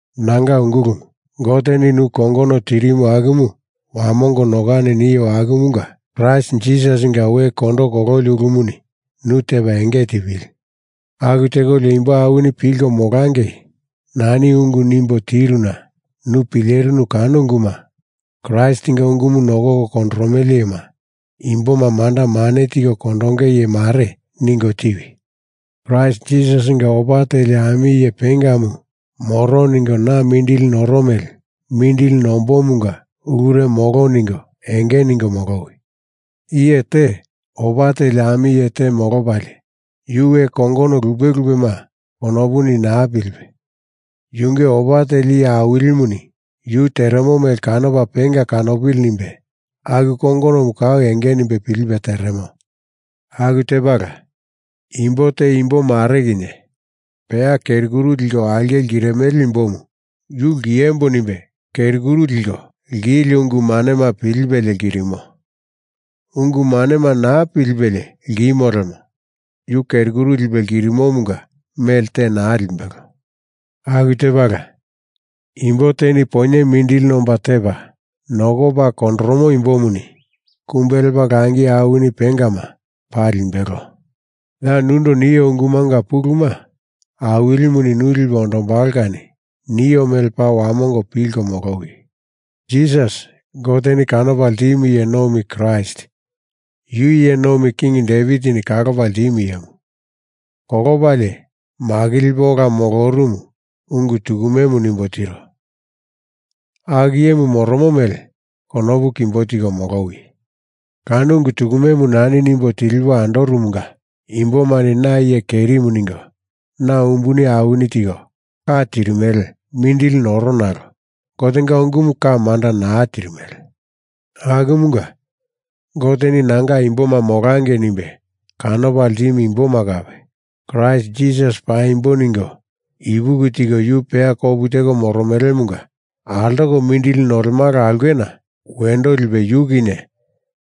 Nanga ungulumu, Goteni nu kongono tirimu akumu wamongo nokani nio akumunga, Kraist Jisasinga we kondo kololi ulumuni nu tepa enge tipili. Aku tekolio imbo awini pilko molangei nani ungu nimbo tiruna nu pilerinu kano unguma Kraistinga ungumu nokoko kondoromele iyema, imboma manda mane tiko kondonge iye mare ningo tiwi. Kraist Jisasinga opa teli ami iye pengamu moro ningo na mindili noro mele mindili nombomunga ulure molo ningo enge ningo molowi. Iye te opa teli ami iye te molopalie, yu we kongono lupe lupema konopuni naa pilipe, yunge opa teli iye awilimuni yu teremo mele kanopa penga kanopili nimbe aku kongonomu kau enge nimbe pilipe teremo. Aku tepala, imbo te imbo mare kinye peya keri kuru liko aulke lkirimele imbomu yu lkiembo nimbe keri kuru liko lkieli ungu manema pilipelie lkirimo. Ungu manema naa pilipelie lkimo lemo yu keri kuru lipe lkirimomunga mele te naa limbelo. Aku tepala, imbo teni poinye mindili nomba tepa nokopa kondoromo imbomuni kumbe lepa langi awini pengama paa limbelo. Ya nundo nio ungumunga puluma Awilimuni nu lipe ondombalo kani nio mele paa wamongo pilko molowi. Jisasi, Goteni kanopa ltimu Iye Nomi Kraist, yu iye nomi king Devitini kalopa ltimu iyemu, kolopalie makilipe ola molorumu ungu tukumemu nimbo tiro, aku iyemu moromo mele konopu kimbo tiko molowi. Kano ungu tukumemu nani nimbo tilipo andoromunga imbomani na iye kerimu ningo na umbuni awini tiko ka tirimele mindili noro nalo Gotenga ungumu ka manda naa tirimele. Akumunga, Goteni nanga imboma molangei nimbe kanopa ltimu imboma kape Kraist Jisasi paimbo ningo ipuki tiko yu peya kopu teko moromelemunga altoko mindili nolemala aulkena wendo lipe yu kinye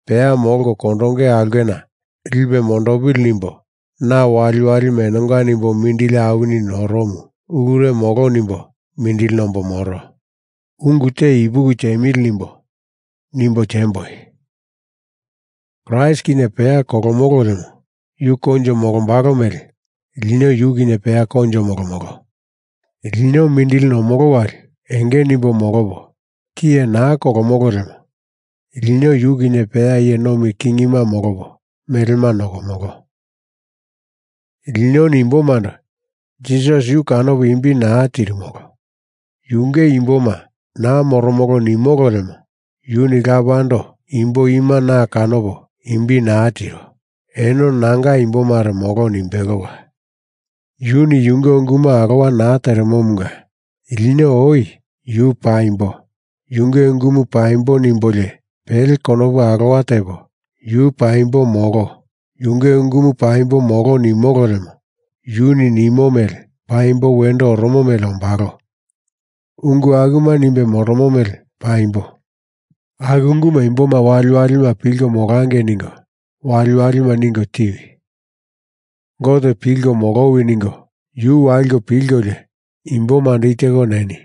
peya molko kondonge aulkena lipe mondopili nimbo na waliwalima enonga nimbo mindili awini noromu, ulure molo nimbo mindili nombo moro. Ungu te, ipuki tiemili nimbo nimbo tiemboi: Kraist kinye peya kolomolo lemo yu koinjo molombalo mele lino yu kinye peya koinjo molomolo. Lino mindili nomolo wali enge nimbo molopo tiye naa kolomolo lemo lino yu kinye peya iye nomi kingima molopo melema nokomolo. Linoni imbomando Jisasi yu kanopo imbi naa tirimolo, Yunge imboma naa moromolo nimolo lemo Yuni Lapando imbo ima na kanopo imbi naa tiro, eno nanga imbomare molo nimbelola. Yuni yunge unguma alowa naa teremomunga lino oi Yu paimbo, Yunge ungumu paimbo nimbolio pele konopu alowa tepo Yu paimbo molo, Yunge ungumu paimbo molo nimolo lemo yuni nimo mele paimbo wendo oromo mele ombalo, ungu akuma nimbe moromo mele paimbo. Aku unguma imboma waliwalima pilko molangei ningo waliwalima ningo tiwi. Gote pilko molowi ningo yu waliko pilkolio imbomando i teko neni.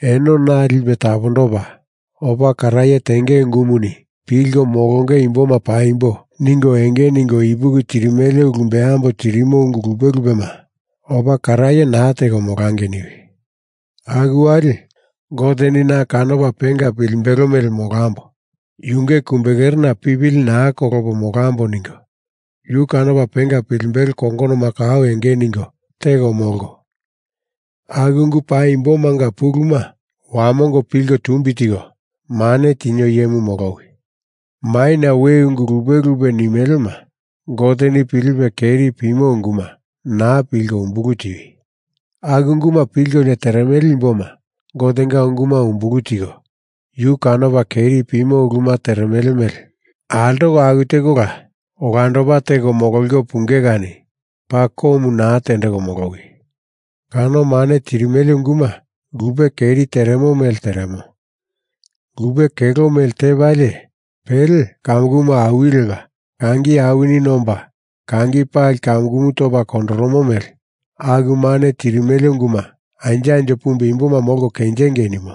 Eno naa lipe tapondopa, opa karaye tenge ungumuni pilko molonge imboma paimbo ningo enge ningo ipuki tirimele ulu beambo tirimo ungu lupe lupema opa karaye naa teko molangei niwi. Aku wali Goteni na kanopa penga pilimbelo mele molambo, Yunge kumbekerena pipili naa kolopo molambo ningo yu kanopa penga pilimbelo kongonoma kau enge ningo teko molko, aku ungu paimbomanga puluma wamongo pilko tumbi tiko mane tinio iyemu molowi. Maina we ungu lupe lupe nimelema, Goteni pilipe keri pimo unguma, naa pilko umbulu tiwi. Aku unguma pilkolio teremele imboma Gotenga unguma umbulu tiko yu kanopa keri pimo uluma teremele mele altoko aku tekola olandopa teko mololiko punge kani paa komu naa tendeko molowi. Kano mane tirimele unguma lupe keri teremo mele teremo. Lupe kelo mele tepalie pele kamukumu awili lepa kangi awini nomba kangi pali kamukumu topa kondoromo mele aku mane tirimele unguma anjo anjo pumbe imboma molko kenjengei nimo.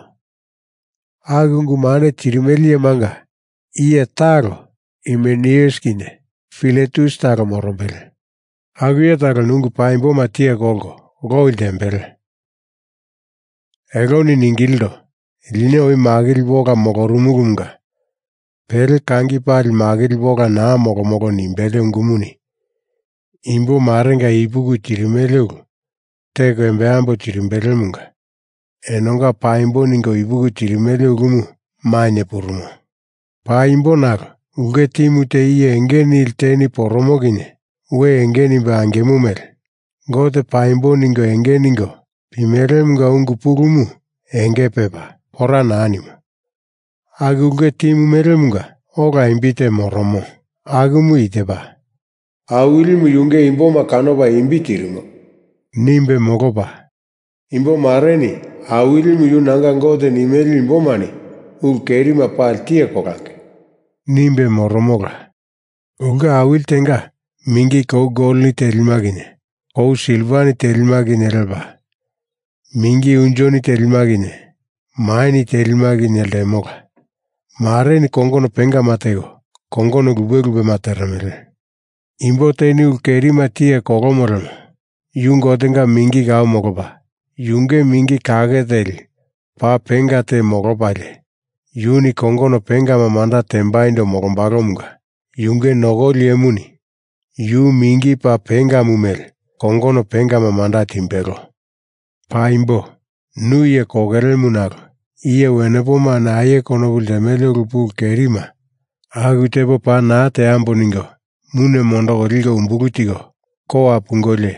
Aku ungu mane tirimele iyemanga iye talo Himeneus kinye Filetus talo morombele. Aku iye taloni ungu paimboma tiye kolko loi ltembele. Eloni ningilindo, lino oi makilipo ola molorumulumunga pele kangi pali makilipo ola naa molomolo nimbele ungumuni imbo marenga ipuki tirimele ulu teko embambo tirimbelemunga enonga paimbo ningo ipuki tirimele ulumu mainye purumo. Paimbo nalo ulke timu te iye enge nili teni poromo kinye we enge nimbe angimo mele, Gote paimbo ningo enge ningo pimelemunga ungu pulumu enge pepa, pora naa nimo. Aku ulke timu melemunga ola imbi te moromo, akumu i tepa: “Awilimu yunge imboma kanopa imbi tirimo,” nimbe molopa, “Imbo mareni Awilimu yu nanga Gote nimele imbomani ulu kerima pali tiye kolangei,” nimbe moromola. Ulke awili tenga mingi kou goloni telima kinye kou silvani telima kinye lepa, mingi unjoni telima kinye maini telima kinye ltemola. Mareni kongono pengama teko, kongono lupe lupema teremele. Imbo teni ulu kerima tiye kolomo lemo yu Gotenga mingi kau molopa, yunge mingi kake teli paa penga te molopalie, yuni kongono pengama manda tembaindo molombalomunga yunge nokoli iyemuni yu mingi paa pengamu mele kongono pengama manda timbelo. Paimbo, nu iye kokelemu nalo iye wenepomani aie konopu ltemele ulu pulu kerima aku tepo paa naa teambo ningo mune mondoko liko umbulu tiko kowa pungolio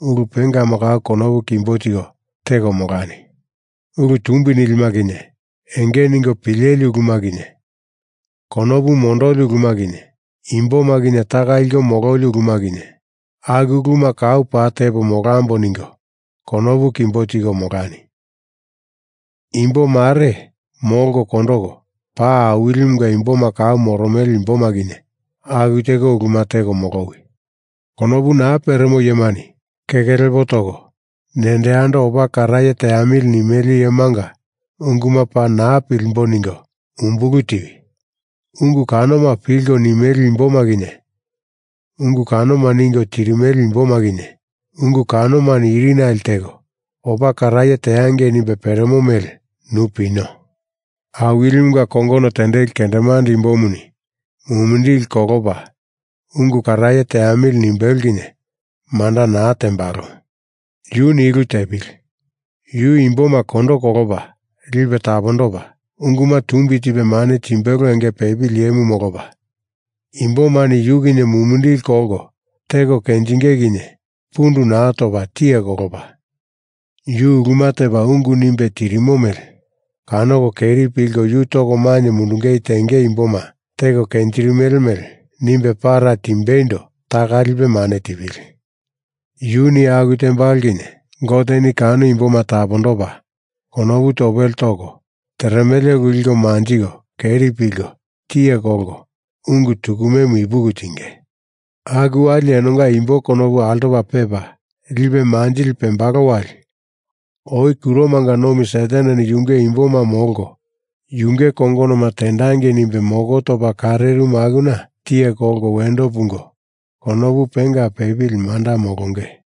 ulu pengama kau konopu kimbo tiko teko molani. Ulu tumbi nilima kinye, enge ningo pileli uluma kinye, konopu mondoli uluma kinye, imboma kinye taka liko mololi uluma kinye, aku uluma kau paa tepo molambo ningo konopu kimbo tiko molani. Imbo mare molko kondoko paa Awilimunga imboma kau moromele imboma kinye aku teko uluma teko molowi. Konopu naa peremo iyemani keke lepo toko nendo yando opa karaye teamili nimele iyemanga unguma paa naa pilimbo ningo umbulu tiwi. Ungu kanoma pilko nimele imboma kinye, ungu kanoma ningo tirimele imboma kinye, ungu kanomani irinale teko opa karaye teangei nimbe peremo mele nu pino. Awilimunga kongono tendeli kendemande imbomuni mumindili kolopa ungu karaye teamili nimbelo kinye manda naa tembalo. Yuni i ulu tepili: Yu imboma kondo kolopa lipe tapondopa, unguma tumbi tipe mane timbelo enge peli iyemu molopa, imbomani yu kinye mumindili kolko teko kenjinge kinye pundu naa topa tiye kolopa, yu uluma tepa ungu nimbe tirimo mele kanoko keri pilko yu toko mainye mundungei tenge imboma teko kenjirimele mele nimbe para timbeindo taka lipe mane tipili. Yuni aku tembalo kinye Goteni kano imboma tapondopa, konopu topele toko teremele ulu liko manjiko keri pilko tiye kolko ungu tukumemu ipuki tinge. Aku wali enonga imbo konopu altopa pepa lipe manjili pembalo wali oi kuromanga nomi Sataneni yunge imboma molko yunge kongonoma tendangei nimbe moko topa karerimu akuna tiye kolko wendo pungo konopu penga pepili manda molonge.